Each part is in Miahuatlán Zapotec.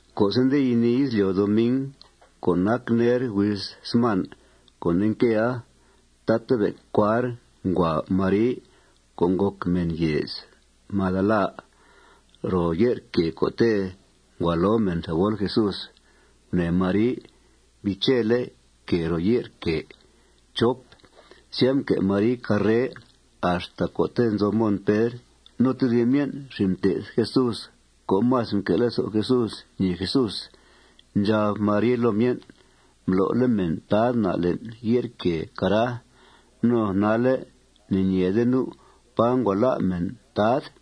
Co'se' nde yinìi izlyo' doming co' nac ner huiz sman co' nde nquea, tatabe' cuar ngua Mari co' ngòc mèn yèez Magdala ro ye'r quèe co'te' ngua lo mèn thebol Jesús. Gunèe Mari mbiichele' quèe ro ye'r quèe. Sya, mque' Mari carre axta co'te' nzo Mon Pedr no tedib myen' xin' mté'th Jesús co' más mque' lezo' Jesús ñèe Jesús. Ndxab Mari loo myen': ―Mblo'le' mèn Tad na' le'n ye'r quèe, cara. No nalle' ne'ñeede nu' pá ngua lá' mèn Tad.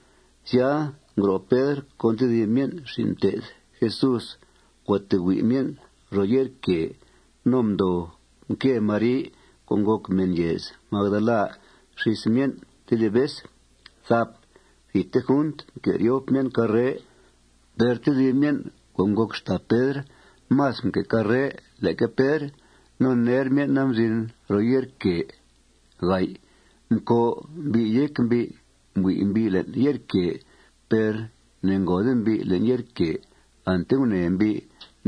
Sya, ngro' Pedr con tedib myen' xin' mté'th Jesús. Ngua tee hui' myen' ro ye'r quèe. No mdoo nque Mari co' ngòc mèn yèez Magdala xís myen' tedib vez. Thidte junt mque' ryop myen' carre. Per tedib myen' co' ngòc xtàa Pedr más mque' carre leque Pedr. No ner myen'a mzin ro ye'r quèe. Mcòo' mbi' yéc mbi'. Mbui' mbi' le'n ye'r quèe per ne'ngòode mbi' le'n ye'r quèe. Ante gunèe mbi'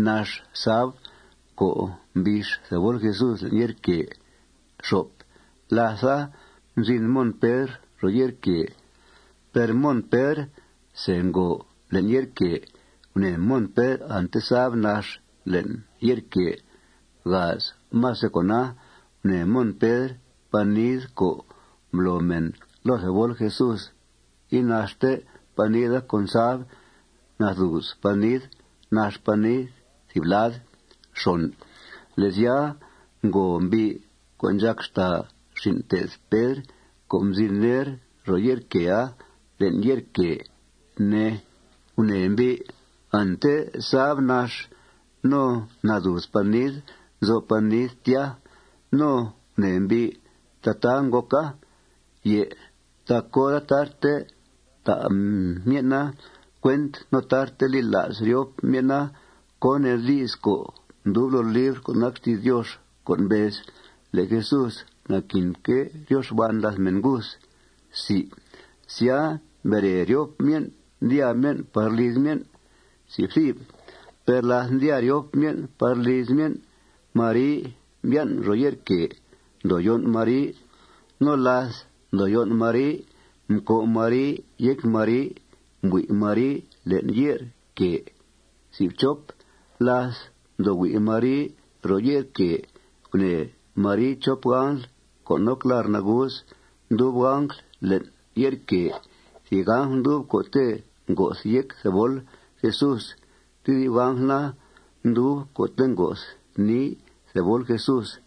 nax sab co' mbix thebol Jesús le'n ye'r quèe. Látha, mzin Mon Pedr ro ye'r quèe. Per Mon Pedr se ngòo le'n ye'r quèe. Gunèe Mon Pedr ante sab nax le'n ye'r quèe. Más de cona, gunèe Mon Pedr panid co' mblo mèn loo thebol Jesús, inaxte panid con sab. Nadùuz panid. Nax panid thìb lad. Le' sya, ngòo mbi' co' ndxàc xtàa xin' mté'th Pedr, co' mzin ner ro ye'r quèe, le'n ye'r quèe, ne. Gunèe mbi' ante sab nax no nadùuz panid nzo'f panid tya. No gunèe mbi' tataa ngòca. Tac hora tarte ta' myen'a cuent no tarte li la's ryop myen'a cón nee di's co' ndub loo libr co' nac xti's Diox co' mbez le' Jesús naquinque' ryo xban làth mèn nguth. Sya, mbere ryop myen', ndyàa myen' par liz myen'. Per láth ndyàa ryop myen' par liz myen', Mari mbyan' ro ye'r quèe. Ndoo yón' Mari. No láth ndoo yón' Mari, mcòo' Mari yéc Mari. Mbui' Mari le'n ye'r quèe. Láth mdoo hui' Mari ro ye'r quèe, gunèe Mari chop angl co' noc lar' nagus. Ndub angl le'n ye'r quèe. Thìb angl ndub co'te' ngo'th yéc thebol Jesús. Tedib angl na, ndub co'te' ngo'th nii thebol Jesús.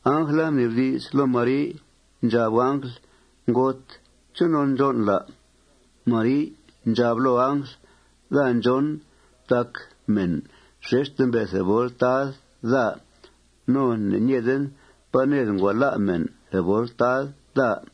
Angla mnibdi's loo Mari. Ndxab angl: ―Ngot, ¿chonon ndxón'l, à'? Mari ndxab loo angl: ―Daa ndxón tac mèn xexte mbe' thebol Tad daa. No ne'ñeeden pá ned ngua lá' mèn thebol Tad daa.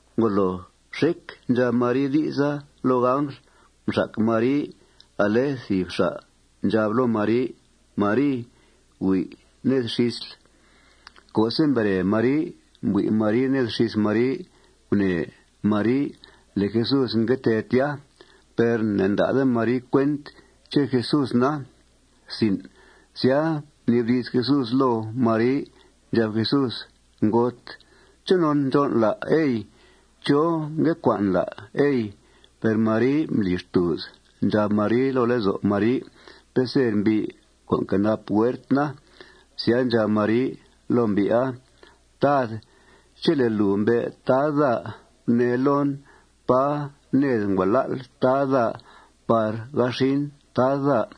Ngolo xec ndxab Mari di'sa loo angl, mxac Mari ale thìb xa' ndxab loo Mari: Mari, hui' ned xísl. Co'se' mbere Mari mbui' Mari ned xís Mari, gunèe Mari le' Jesús ngue tee tya. Per ne'ta'de Mari cuent ché' Jesús na. Sya, mnibdi's Jesús loo Mari. Ndxab Jesús: ―Ngot, ¿chonon ndxón'l, à', ey? ¿Chó ngue cua'nl, à', ey? Per Mari mbli xtùuz. Ndxab Mari loo lezo' Mari peser mbi' co' nquenap huert na. Sya ndxab Mari loo mbi'a: ―Tad, chele' lùu mbe' Tad daa, gunee loon pá ned ngua lá'l Tad daa par ga xin Tad daa.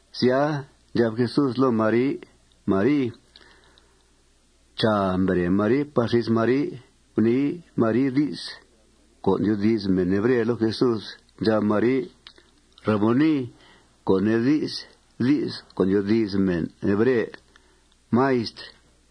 Sya, ndxab Jesús loo Mari: Mari. Chàa, mbere Mari par xís Mari. Gunii Mari di's co' ndyoodi's mèn hebre loo Jesús. Ndxab Mari: ―Raboni, co' nee di's di's co' ndyoodi's mèn hebre, Maistr.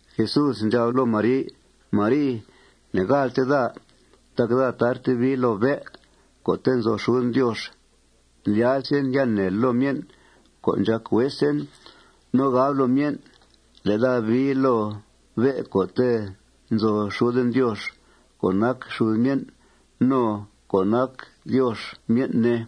Jesús ndxab loo Mari: ―Mari, ne'gàaltel daa tac daa tarte bii loo bé' co'te' nzo xuden Diox. Ndlyazen ya neel loo myen' co' ndxàc huesen. No gabl loo myen' le' daa bii loo bé' co'te' nzo xuden Diox co' nac xud myen' no co' nac Diox myen', ne.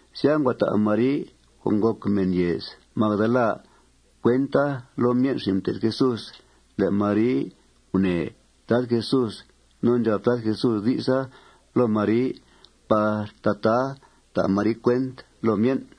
Sya, ngua ta' Mari, co' ngòc mèn yèez Magdala, cuenta loo myen' xin' mté'th Jesús le' Mari gunèe Tad Jesús no ndxab Tad Jesús di'sa loo Mari par tataa ta' Mari cuent loo myen'.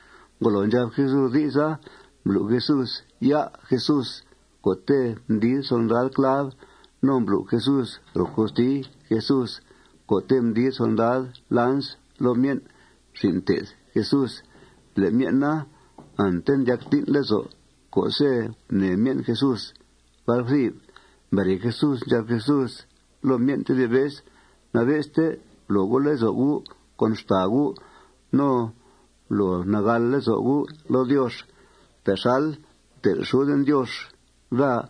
Ngolo ndxab Jesús di'sa, mblu' Jesús ya' Jesús co'te' mdid solndad clav. No mblu' Jesús ro costi Jesús co'te' mdid solndad lans loo myen' xin' mté'th Jesús. Le' myen' na, ante mdyac tín' lezo' co'se' gunèe myen' Jesús. Mbere Jesús, ndxab Jesús loo myen' tedib vez: ―Nabe'ste blo gu' lezo' gu' con xtàa gu'. No blo nagàl lezo' gu' loo Diox. Texal mtel' xuden Diox daa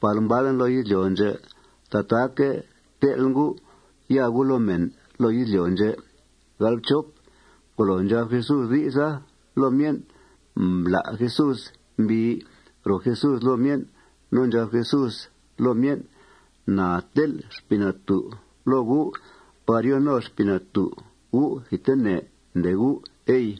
par mbalen loo izlyo' ndxè', tataaque' tel'en gu' ya gu' loo mèn loo izlyo' ndxè'. Ngolo ndxab Jesús di'sa loo myen', mblá' Jesús mbii ro Jesús loo myen'. No ndxab Jesús loo myen': ―Na tel' Xpii Natú' loo gu' par yo no Xpii Natú' gu' thidtene, ndee gu', ey.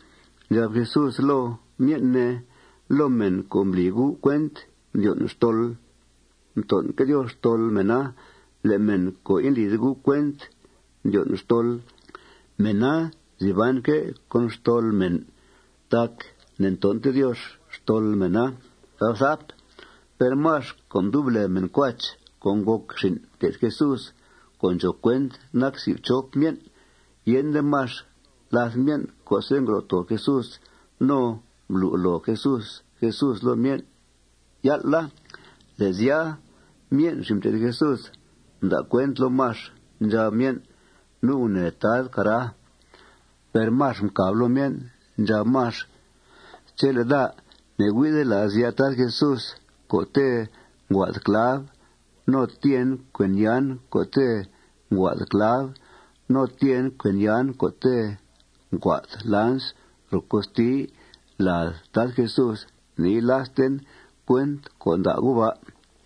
Ndxab Jesús loo myen', ne: ―Loo mèn co' mbli gu' cuent mdyon' xtol, mton'que' Diox xtol mèna. Le' mèn co' indlide gu' cuent mdyon' xtol, mèna nzi banque' con xtol mèn tac ne'nton'te Diox xtol mèna. Per Max co' mdub lèe mèn Cuach co' ngòc xin' mté'th Jesús, co' ndxòo cuent nac si' fchop myen', yende Max làth myen' co'se' ngro' too Jesús no mblu' loo Jesús Jesús loo myen' yál'a. Le' sya, myen' xin' mté'th Jesús mda' cuent loo Max. Ndxab myen': ―Nu' gunèele' Tad, cara. Per Max mcàb loo myen'. Ndxab Max: ―Chele' daa ne'hui'de la's ya' Tad Jesús co'te' nguaa'd clav no tyeen cuen yan co'te' nguaa'd clav no tyeen cuen yan co'te' nguaa'd lans ro costi lad Tad Jesús, ne'yila'sten cuent co' nda' gu' ba'.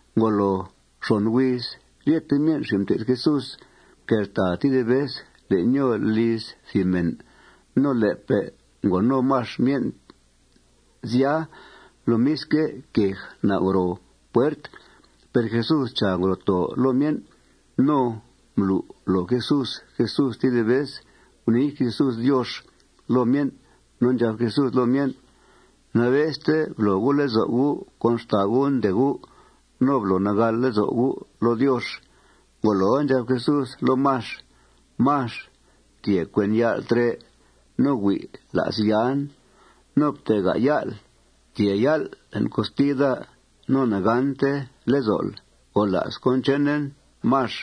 Ngoloo xon huiz ryete myen' xin' mté'th Jesús mqueltàa tedib vez le'n nyòo liz thìb mèn. No le'pe' ngo no Max myen' sya. Lomisque', quej nau' ro puert. Per Jesús, chàa, ngro' too loo myen'. No mblu' loo Jesús Jesús tedib vez. Gunii Jesús Diox loo myen'. No ndxab Jesús loo myen': ―Nabe'ste blo gu' lezo' gu' con xtàa gu', ndee gu'. No blo nagàl lezo' gu' loo Diox. Ngoloa, ndxab Jesús loo Max: ―Max, ftyee cuen ya'l trè' no hui' la's yan. No ftega' ya'l. Ftyee ya'l le'n costi daa. No ne'gànte lezo'l. Gola's cón chenen, Max.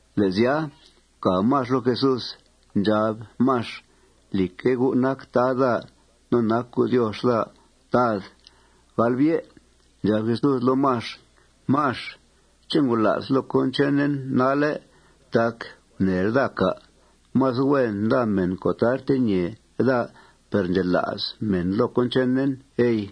Le' sya, mcàb Max loo Jesús. Ndxab Max: ―Lìcque', U' nac Tad daa no nac U' Diox daa, Tad. Ndxab Jesús loo Max: ―Max, ¿ché' ngola'sl loo cón chenen nalle' tac gunèel daa, cà'? Más huen nda mèn co' tarte ñèe daa per ndxela's mèn loo cón chenen, ey.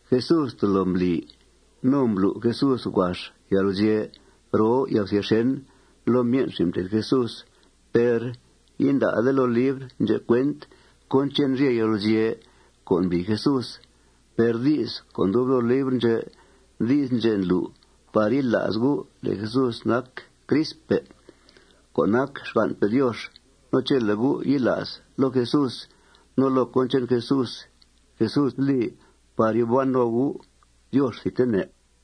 Jesús tolo mbli no mblu' Jesús huax yalguzye' roo yalguzye' xèn loo myen' xin' mté'th Jesús. Per inda'de loo libr ndxè' cuent cón che'n rye yalguzye' co' mbli Jesús. Per di's co' ndub loo libr ndxè', di's ndxè' ndlu' par yila's gu' le' Jesús nac Cristpe' co' nac xgan'pe' Diox. No chele' gu' yila's loo Jesús no loo cón che'n Jesús, Jesús li par yòo ban no gu' Diox thidtene.